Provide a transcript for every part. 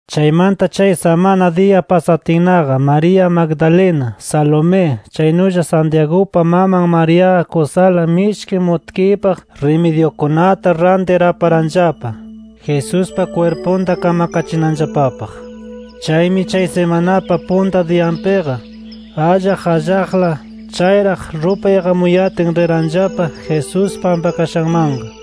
Chaymanta chay samana diya pasatinnaqa María Magdalena, Salomé chaynulla Santiagupa maman Mariaqa kusala mishki mutkiypaq rimidyukunata rantir aparanllapa, Jesuspa kwirpunta kamkachinanllapapaq. Chaymi chay simanapa punta diyanpiqa, allaq allaqla chayraq rupay iqamuyatin riranllapa Jesús pampakashanmanqa.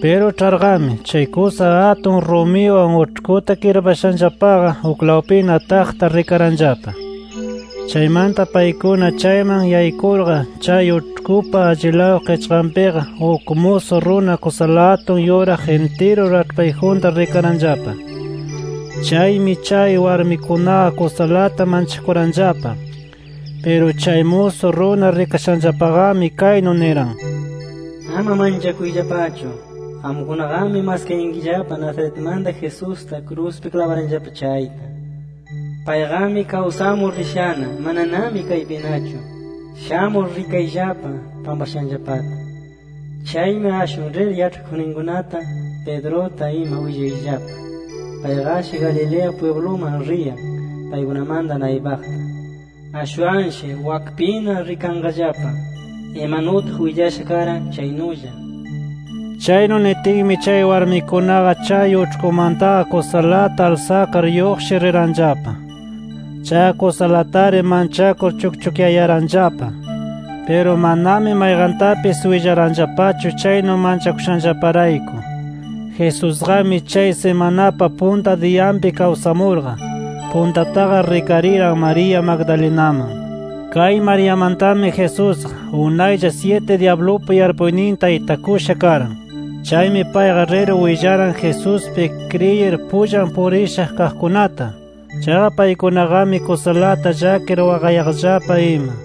Piru ĉharqami, chay kusa atun rumiwan uĉhkuta kirpashanllapaqa uklawpina taqta rikaranllapa. Chaymanta paykuna chayman yaykurqa chay uĉhkupa allilaw qichqanpiqa uk musu runa, kusala atun yuraq intiru raĉhpayjunta rikaranllapa. Chaymi chay warmikunaqa kusalata manchakuranllapa. Piru chay musu runa rikashanllapaqami kaynu niran: “Ama manchakuyllapachu. Qamkunaqami maskayankillapa Nazaretmanta Jesusta kruspi klabaranllapa chayta. Payqami kawsamur rishana; mananami kaypinachu. Shamur rikayllapa pampashanllapata. Chaymi ashwan rir yaĉhakuqninkunata, Pedruta ima willayllapa: Payqashi Galilea pwibluman riyan paykunamanta naypaqta; ashwanshi wakpina rikanqallapa, imanutaq willasha karan chaynulla”. Chaynu nitinmi chay warmikunaqa chay uĉhkumantaqa kusalata alsakar lluqshir riranllapa. Chaqa kusalatari manchakur chukchukyayaranllapa. Piru manami mayqantapis willaranllapachu chaynu manchakushanllaparayku. Jesusqami chay simanapa punta diyanpi kawsamurqa, puntataqa rikariran María Magdalenaman. Kay Mariamantami Jesusqa, unaylla syiti dyablupa yarpuyninta itakusha karan. Chaymi payqa rir willaran Jesuspi kriyir pullan purisha kaqkunata. Chaqa paykunaqami kusalata llakir waqayaqllapa ima.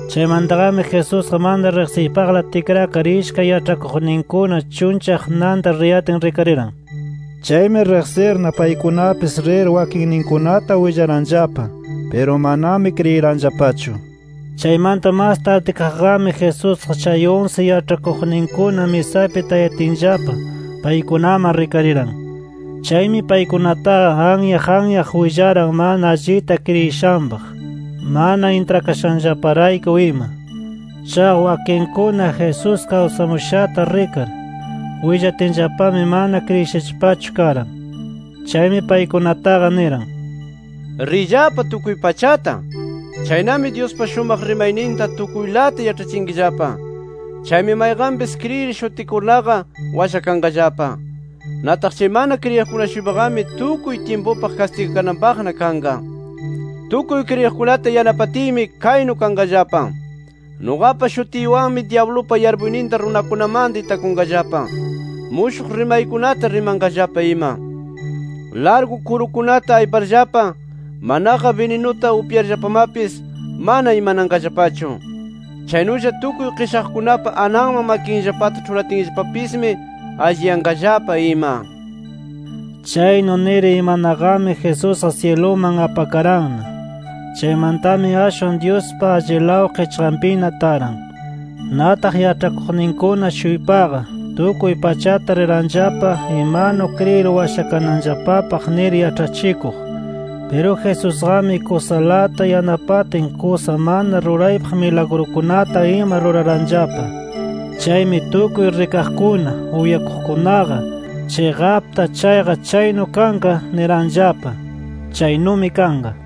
Chaymantaqami Jesusqa mana riqsiypaqla tikrakar ishkay yaĉhakuqninkuna chunllaq nanta riyatin rikariran. Chaymi riqsirna paykunapis rir wakinninkunata willaranllapa. Piru manami kriyiranllapachu. Chaymanta mas tardikaqqami Jesusqa chay unsi yaĉhakuqninkuna misapi tayatinllapa, paykunaman rikariran. Chaymi paykunataqa anyaq anyaq willaran mana allita kriyishanpaq, mana intrakashanllaparayku ima. Chaqa wakinkuna, Jesús kawsamushata rikar, willatinllapami mana kriyishallapachu karan. Chaymi paykunataqa niran: “Riyllapa tukuy pachata. Chaynami Dyuspa shumaq rimayninta tukuylata yaĉhachinkillapa. Chaymi mayqanpis kriyir shutikurnaqa, washakanqallapa. Nataq chay mana kriyiqkuna-shuypaqami tukuy tyimpupaq kastigakananpaqna kanqa. Tukuy kriyiqkunata yanapatiymi kaynu kanqallapa: Nuqapa shutiywanmi dyablupa yarpuyninta runakunamanta itakunqallapa; mushuq rimaykunata rimanqallapa ima. Largu kurukunata ayparllapa, manaqa bininuta upyarllapamapis mana imananqallapachu. Chaynulla tukuy qishaqkunapa ananman makinllapata ĉhuratinllapapismi, alliyanqallapa ima”. Chaynu nir imanaqami Jesusqa syiluman apakaranna. Chaymantami ashwan Dyuspa allilaw qichqanpina taran. Nataq yaĉhakuqninkuna-shuypaqa tukuy pachata riranllapa imanu kriyir washakananllapapaq nir yaĉhachikuq. Piru Jesusqami kusalata yanapatin kusa mana ruraypaq milagrukunata ima ruraranllapa. Chaymi tukuy rikaqkuna, uyakuqkunaqa chiqapta chayqa chaynu kanqa niranllapa. Chaynumi kanqa.